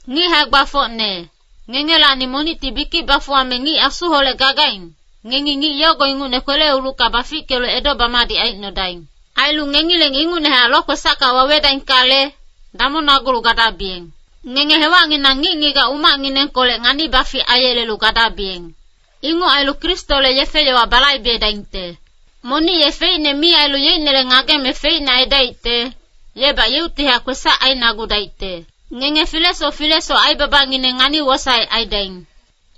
Ngic hae-gbafocne, ngengelacni monicti bikic bafuwame ngic Asuholec gagaing, ngengi ngic yogo ingucne kwele-ulucka bafickelu edo-bamadic aicnodaing. Ailu ngengileng ingucnehac lokwesacka wawedaingkale, damongnagulu gadabiyeng. Ngenge hewacnginang ngic-ngigac umacnginengkolec ngani-bafic aiyelelu gadabiyeng. Inguc ailu Kristole yefe-yowa balaibedaingte. Monic ye feicne mi ailu yeicnele ngageme feicne aidaicte, yebac yeuctihac kwesac ainagudaicte. Ngenge filesoc filesoc aibabangineng ngani-wosaec aidaing.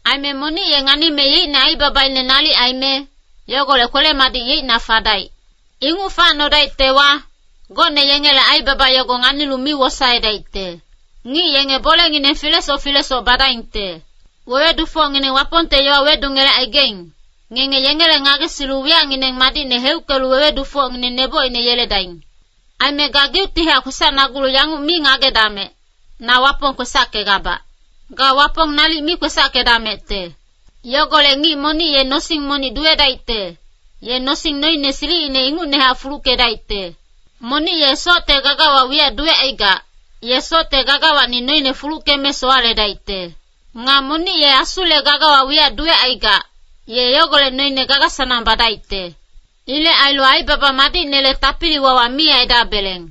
Aime monic ye nganime yeicne aibabaine nalic aime, yogolec kwele-madic yeicna fadaic. Inguc facnodaictewa, gocne yengele aibaba yogo nganilu mi wosaedaicte. Ngic yenge bolengineng filesoc filesoc badaingte. Wewedufocngineng Wapongte yowa wedungelecaigaing, ngenge yengele ngagesilu wiyacngineng madicne heuckelu wewedufocngineng nebocine yeledaing. Aime gageuctihac kwesacnagulu yanguc mi ngagedamec, “Na Wapong kwesackegabac.” Ga Wapong nalic mi kwesackedamecte. Yogolec ngic monic ye nosing monic duwedaicte, ye nosing noine silicine ingucnehac fuluckedaicte. Monic ye socte gagawa wiyac duwecaigac, ye socte gagawacni noine fuluckeme sowaledaicte. Nga monic ye Asule gagawa wiyac duwecaigac, ye yogolec noine, gaga-sanang badaicte. Ilec ailu aibaba madicnele tapili-wawa mi aidabeleng.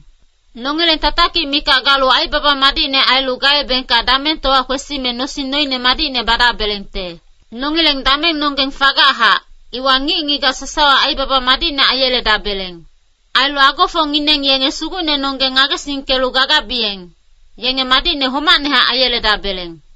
Nongileng tatakic mikac galu aibaba madicne ailu gaebengka damengtowa kwesime nosing noine madicne badabelengte. Nongileng damengnonggeng fagachac, iwa ngic-ngigac sasawa aibaba madicne aiyeledabeleng. Ailu agofocngineng yenge Sugucnenonggeng ngagesingkelu gagabiyeng, yenge madicne homacnehac aiyeledabeleng.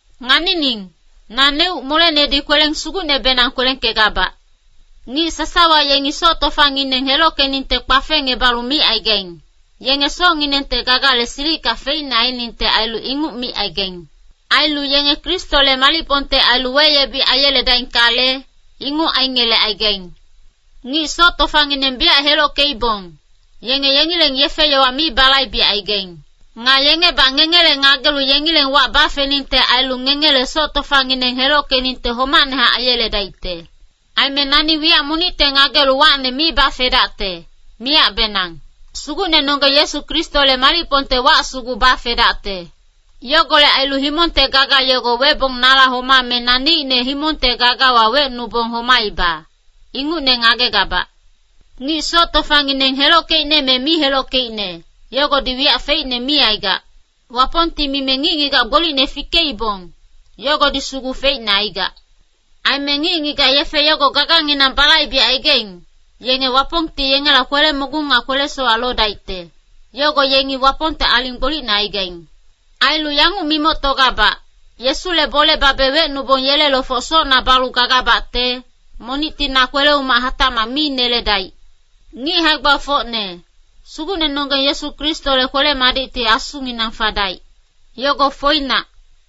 Nganining, naneuc molenedi kweleng sugucnebenang kwelengkegabac. Ngic sasawa yengi soc tofangineng helockeningte kpafengngebalu micaigaing, yenge socnginengte gagale silicka feicne ainingte ailu inguc micaigaing. Ailu yenge Kristole malicpongte ailu weyebic aiyeledaingkale, inguc aingelecaigaing. Ngic soc tofangineng biyac helockeibong, yenge yengileng yefe-yowa mi balaibecaigaing. Nga yengebac ngengele ngagelu yengileng wac bafeningte ailu ngengele soc tofangineng helockeningte homacnehac aiyeledaicte. Aime nani wiyac monicte ngagelu wacne mi bafedacte, miyacbenang. Sugucnenonggeng Yesu Kristole malicpongte wac sugu bafedacte. Yogolec ailu himongte gaga yogo webong nala homame naneicne himongte gagawa wecnubong homaiba, ingucne ngagegabac. Ngic soc tofangineng helockeicne me mi helockeicne, yogodi wiyac feicne mi aigac. Wapongti mime ngic-ngigac gbolicne fikeibong, yogodi sugu feicne aigac. Aime ngic-ngigac yefe yogo gaganginang balaibecaigaing, yenge Wapongti yengela kwele-mogung nga kwele-sowac lodaicte, yogo yengi Wapongte aling gbolicne aigaing. Ailu yanguc mimoctogabac, Yesule bole babe wecnubong yele lofoc socna balu gagabacte, monicti na kwele-umac hatacmac mi neledaic. Ngic hae-gbafocne, Sugucnenonggeng Yesu Kristole kwele-madicti asunginang fadaic. Yogo foinac.